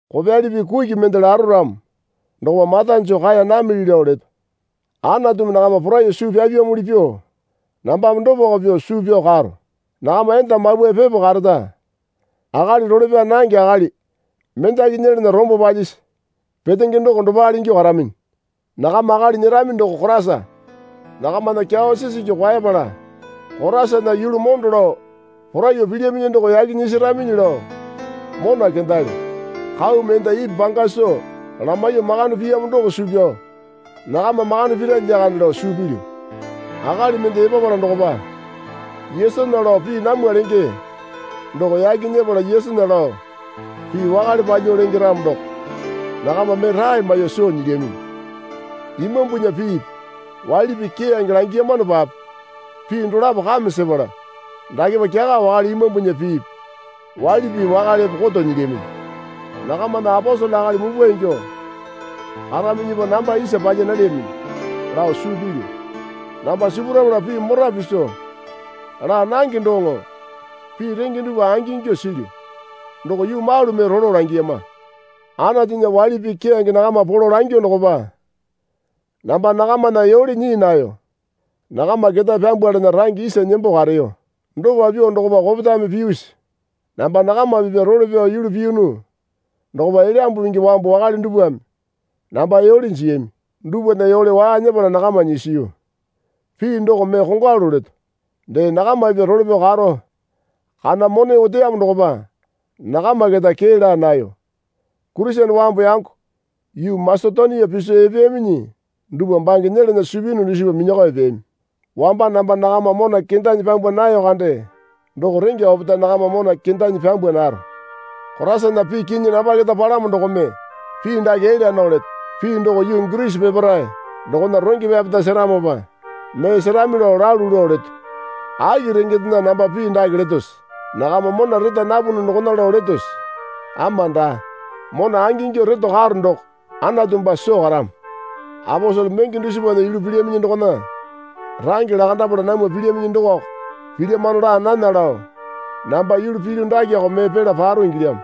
Kopyali pii kuki mende laro ramo dokopa mata joo kaeya namili lao leto. Anatumi nakama poraiyuo suu pyapyamuli pyuo nambame dopako pyuo suu pyao karo. Nakama enda mapwae pepo kareta, akali role pyaa nange akali mendaki nyelana rombo palyisi petenge doko dopale ingyuo karaminyi. Nakama akali nyerami doko Koraisa. Nakamana kyawa sisingi kwaepala Koraisana yulu mondo lao poraiyuo pilyaminyi doko yaki nyesaraminyi lao mona kendalyo. Kaumi enda Ipi panga soo lamaiyuo makande piyamo doko suu pyao nakama makande pira lyakande lao suu pilyu. Akali mende epapala dokopa Yesunya lao pii namwa lenge doko yaki nyepala Yesunya lao pii wakale palyuo lenge ramo doko nakama mee rae maiyuo soo nyilyaminyi. Imambunya piipi waili pii keyange langiyamanopape pii dolapo kame sepala dakepa kyaka wakale imambunya piipi waili pii wakalepe koto nyilyaminyi. Nakamana aposele akali mupwa ingyuo karaminyipa namba isa palya nalyaminyi lao suu pilyu. Namba sipurapala pii mora piso laa nange doŋo pii renge dupwa angingyuo silyu. Doko yuu malu mee rolo langiyama. Anatunya waili pii keyange nakama polo langyuo dokopa namba nakamana yole nyii nayo. Nakama ketae pyambwalana range isa nembo kareyo. Dopa pyuo dokopa kopetame piyusi? Namba nakama pipya role pyao yulu piyunu dokopa Elyambu Pingi wambu wakale dupwame namba yole jiyami. Dupwana yole waa nyepala nakama nyisiyu. Pii doko mee kongwalu leto. Dee nakama pipya role pyao karo kana mone oteyamo dokopa nakama keta kee laa nayo. Kurisene wambu yango yuu Masetonia piso epeyaminyi dupwa bange nyelana suu piyunu dusipa minyakao epeyami. Wamba namba nakama mona kendanyi pyambwa nayo kande doko rengya opetae nakama mona kendanyi pyambwa naro. Koraisana pii kinyi namba keta palamo dokome pii dake elya nao leto. Pii doko yuu Girisi peparae dokona range pyapeta seramopa mee serami lao lalu lao leto. Aki rengendena namba pii dake letose? Nakama mona reta napunu dokona lao letose? Ama daa. Mona angingyuo reto karo doko Anatu baa soo karamo. Aposele menge dusipana yulu pilyaminyi dokona range lakandapala namwa pilyaminyi dokoko pilyamano laa nana lao namba yulu pilyu dakeko mee pela paro ingilyamo.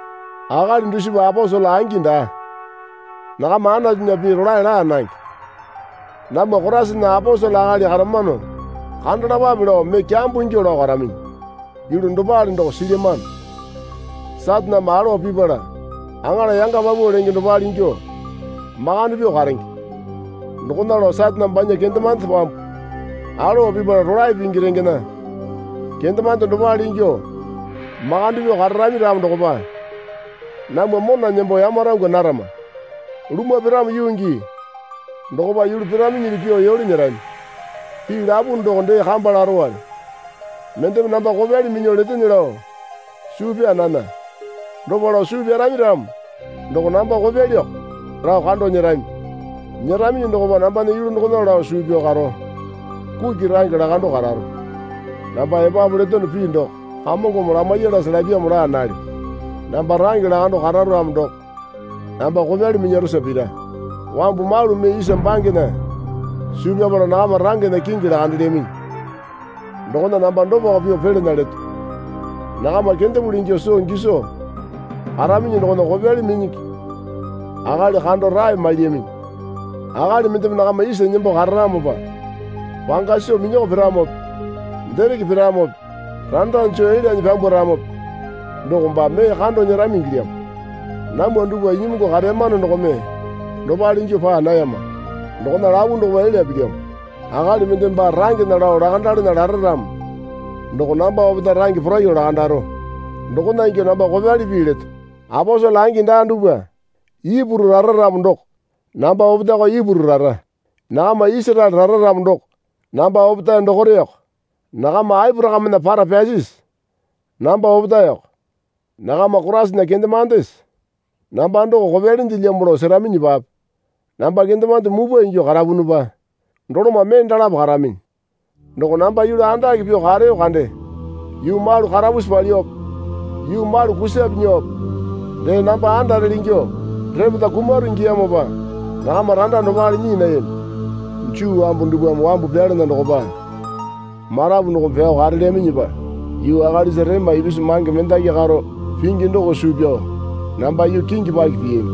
Akali dusipa aposele angi daa. Nakama Anatunya pii rolae laa nange. Namwa Koraisana aposele akali karamano kandalapape lao mee kyambo ingyuo lao karaminyi. Yulu dopale doko silyamano. Sataneme alowa pipala aŋala yanga paupau lenge dopale ingyuo makande pyuo karenge. Dokona lao Satane banya kendemande wambu alowa pipala rolae pingi rengena kendemande dopale ingyuo makande pyuo kararami ramo dokopa namwa mona nembo yamarangwa narama. Lumwa piramo yuu gii dokopa yulu piraminyili pyuo yole nyerami. Pii lapunu doko dee kamba larowale. Mendeme namba kopyali minyuo letene lao suu pyaa nana. Dopa lao suu pyarami ramo doko namba kopyaliyoko lao kando nyerami. Nyeraminyi dokopa nambana yulu dokona lao suu pyao karo kuki range lakando kararo. Namba epapu letono pii doko Kamongome lamaiyalase lapyamo laa nalyo. Namba range lakando kararo ramo doko namba kopyali minyarosa pira. Wambu malu mee isa bangena suu pyapala nakama rangena kingi lakandelyaminyi dokona namba dopako pyuo pelana leto. Nakama kendepuli ingyuo soo giso karaminyi dokona kopyali minyingi akali kando rae mailyaminyi. Akali mendeme nakama iso nembo kararamopa panga soo minyako piramope dereke piramope randa joo elyanyi pyambwaramope doko baa mee kando nyerami ingilyamo. Namwa dupwa inyimungu kareyamano dokome dopale ingyuo paa nayama. Dokona lapu dokopa elya pilyamo. Akali mendeme baa rangena lao lakandalana lara ramo doko namba opetae range poraiyuo lakandaro. Dokona ingyuo namba kopyali pii leto. Aposele angi daa dupwa, Ipuru rara ramo doko namba opetaeko Ipuru rara. Nakama Isaraele rara ramo doko namba opetae dokoreko. Nakama Aporakamena para pyasisi? Namba opetaeko. Nakama Koraisana kendemandese? Namba doko kopyalindelyamo lao seraminyipape namba kendemande mupwa ingyuo karapunupa doloma mee dolapo karaminyi. Doko namba yulu andake pyuo kareyo kande. Yuu malu karapusi palyuope yuu malu kusape nyuope dee namba andarele ingyuo repeta kumaro ingiyamopa nakama randa dopale nyii nayami. Juu wambu dupwame wambu pyalana dokopa marapu dokome pyao karelyaminyipa yuu akalisa rema ipisu mange mendaki karo pingi doko suu pyao namba yuu kingi paki piyami.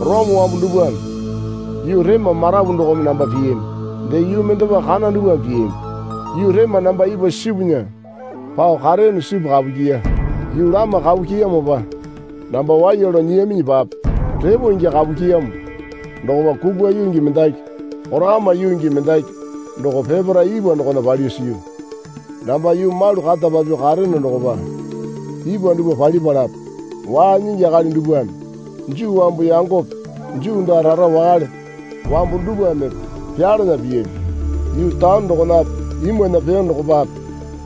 Orome wambu dupwame yuu rema marapu dokome namba piyami. Dee yuu mendepa kana dupwame piyami. Yuu rema namba ipwa sipunya pao kareyono sipu kapu kyiya. Yuu lama kapu kyiyamopa namba waiya lao nyiyaminyipape repo ingyuo kapu kyiyamo dokopa kukwa yuu gii mendaki korakama yuu gii mendaki doko peparae ipwa dokona palyuo siyu. Namba yuu malu kata papyuo kareyono dokopa ipwa dupwa palipalape waa nyingi akali dupwame Juu wambu yangope Juu daa rara wakale wambu dupwamepe pyalana piyami. Yuu taone dokonape imwana peyo dokopape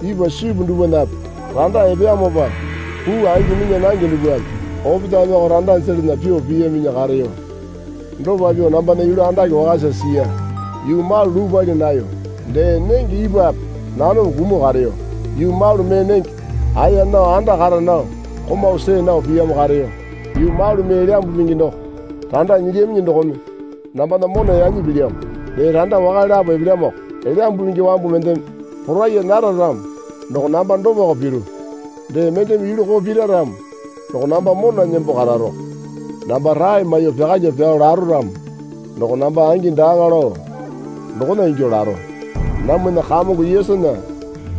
ipwa sipu dupwanape randa epeyamopa puu angi minya nange dupwame opetaemeko randa jelana pyuo piyaminyi kareyo. Dopa pyuo nambana yulu andake wakasa siya. Yuu malu luu pali nayo. Dee nenge ipwape nanome kumuo kareyo. Yuu malu mee nenge aeya nao anda kara nao komau see nao piyamo kareyo. Yuu malu mee Elyambu Pingi doko randa nyilyaminyi dokome nambana mona yanyi pilyamo. Dee randa wakale lapo epelyamoko. Elyambu Pingi wambu mendeme poraiya nara ramo doko namba dopako piru. Dee mendeme yulu koo pira ramo doko namba mona nembo kararoko. Namba rae maiyuo pyakalyuo pyao laro ramo doko namba angi daaŋa lao dokona ingyuo laro. Namwana Kamongo Yesunya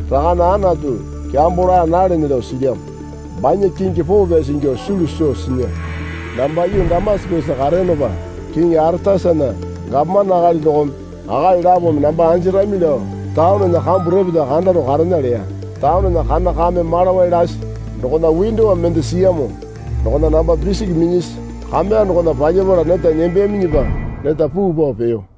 Rakane Anatu, kyambo laa nalene lao silyamo. Banya kingi poo pyasi ingyuo sulu soo sinya. Namba yuu Damasakesa kareyonopa Kiŋi Aretasana gapomane akali dokome akali lapome namba anjirami lao taonena kambu repeta kandaro karena leya. Taonena kana kame malawai lasi dokona windowa mende siyamo dokona namba pisiki minyasi kameya dokona palyapala neta nembeyaminyipa neta puu pao peyo.